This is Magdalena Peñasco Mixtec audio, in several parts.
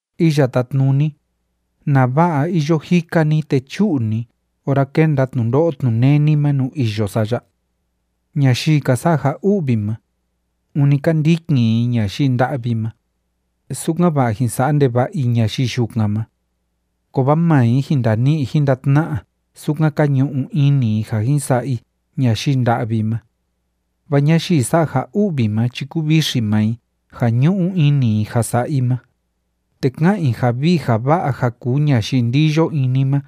Iya Tátnuni, ¿nava'a iyo jika ni te chú'u ni ora kénda tnundo'o tnuneni ma nuu iyo sa ya? Ñayii ka sa'a ja u'vi ma, ûni ka ndikin i ñayii nda'vi ma, sukan‑va'a jin sa'a ndeva'a i ñayii yukan ma. Kovaa maa i jin ndani'i jin ndatna'a sukan ka ñu'u ini i ja jin sa'a i ñayii nda'vi ma. Vaa ñayii sa'a ja u'vi ma chi kúvixi maa i ja ñu'u ini i ja sa'a i ma, te ká'an i ja vii ja va'a ja kuu ñayii ndiyo ini ma,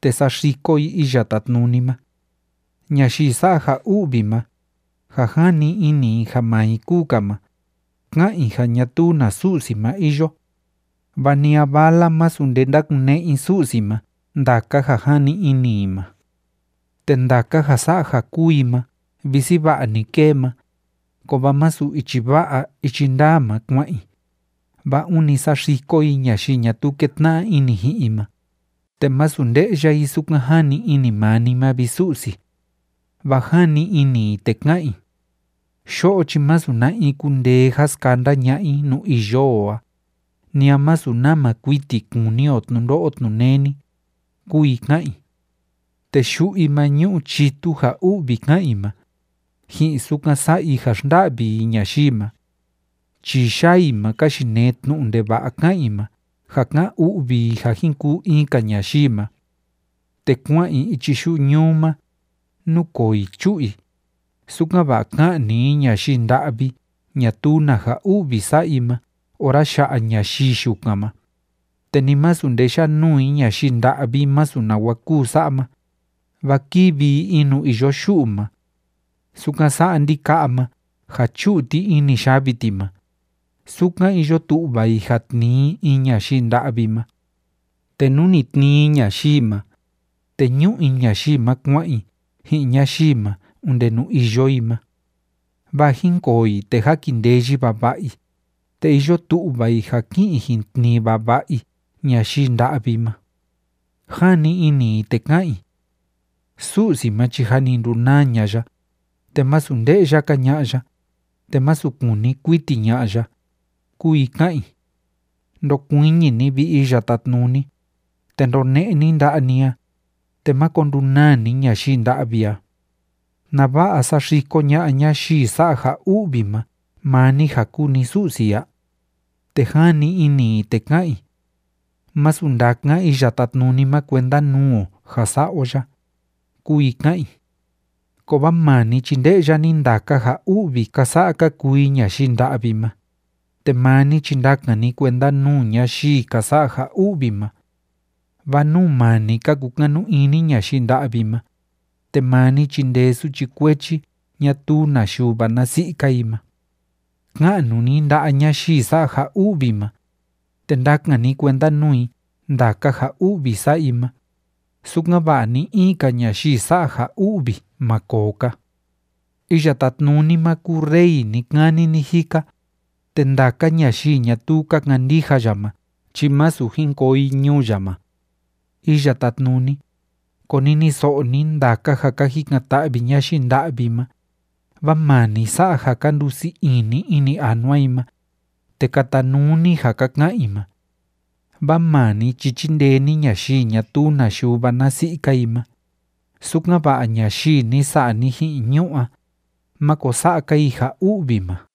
te saxiko i Iya Tátnuni ma. Ñayii sa'a ja u'vi ma, ja jani ini i ja maa i kúu‑ka ma, ká'an i ja ñatuu na Su'si ma iyo. Va ni a vala masu nde ndakune'e i Su'si ma ndaka ja jani ini i ma. Te ndaka ja sa'a ja kúu i ma visi va'a‑ni kée ma, kovaa masu ichi va'a ichi ndaa ma kua'an i, vaa ûni saxiko i ñayii ñatuu kétna'a ini ji'in i ma, te másu nde'ya i sukan jani ini maa ni ma, vi Su'si. Vaa jani ini i te ká'an i: “Yo'o chi masu na in kundee ja skanda ña'a i nuu iyo o a, ni a masu nama kuiti kuni o tnundo'o tnuneni”, kúu i ká'an i. Te yu'u i ma ñu'u chitu ja u'vi ká'an i ma, ji'in sukan sa'a i ja xnda'vi i ñayii ma. Chii yaa i ma ka yinee tnu'u ndeva'a ká'an i ma ja ká'an u'vi i ja jin kuu in‑ka ñayii ma. Te kua'an i ichi yu'u ñuu ma, núkoo i chú'u i, sukan‑va'a ka'ni i ñayii nda'vi ñatuu na ja u'vi sa'a i ma ora ya'a ñayii yukan ma, te ni masu nde yá'a nuu i ñayii nda'vi masu nawa kúu sa'a ma, vaa kívi i in nuu iyo yu'u ma. Sukan sa'a ndika'a ma ja chú'u ti ini yavi ti ma, sukan iyo tu'va i ja tnii i in ñayii nda'vi ma. Te nú ni tnii i ñayii ma, te ñú'u i ñayii ma kua'an i ji'in ñayii ma onde nuu iyo i ma. Vaa jínkoo i, te jákindeyi vava'a i, te iyo tu'va i ja ki'in i jin tnii vava'a i ñayii nda'vi ma. Jani ini i te ká'an i: “Su'si ma chi jâ ni ndunaa ña'a ya, te másu nde'ya‑ka ña'a ya, te masu kuni kuiti ña'a ya”, kúu i ká'an i. Ndokuiñi ni, vi Iya Tátnuni, te ndone'e ni nda'a ni a, te máko ndunaa ni ñayii nda'vi a. ¿Nava'a saxiko ña'a ñayii sa'a ja u'vi ma maa ni ja kúu ni Su'si a? Te jani ini i te ká'an i: “Masu ndakan Iya Tátnuni ma kuenda nuu o ja sa'a o ya”, kúu i ká'an i. Kovaa maa ni chi nde'ya ni ndaka ja u'vi ka sa'a ka kuu i ñayii nda'vi ma, te maa ni chi ndakan ni kuenda nuu ñayii ka sa'a ja u'vi ma, vaa nuu maa ni ka kukanu ini ñayii nda'vi ma, te maa ni chíndee suchi kuechi ñatuu na yuva na si'i‑ka i ma. Ka'nu ni nda'a ñayii sa'a ja u'vi ma, te ndakan ni kuenda nuu i ndaka ja u'vi sa'a i ma, sukan‑va'a ni‑in‑ka ñayii sa'a ja u'vi ma koo‑ka. Iya Tátnuni ma kúu Rey ni‑kani ni‑jika, te ndaka ñayii ñatuu ka kandija ya ma chi másu jin koo i ñuu ya ma. Iya Tátnuni, koniniso'o ni ndaka ja ka jikan‑ta'vi ñayii nda'vi ma, vaa maa ni sa'a ja ka ndusii ini ini anua i ma, te katanuu ni ja ka ka'an i ma. Vaa maa ni chi chíndee ni ñayii ñatuu na yuva na si'i‑ka i ma, sukan‑va'a ñayii ni sa'a ni ji'in ñu'ú a, máko sa'a‑ka i ja u'vi ma.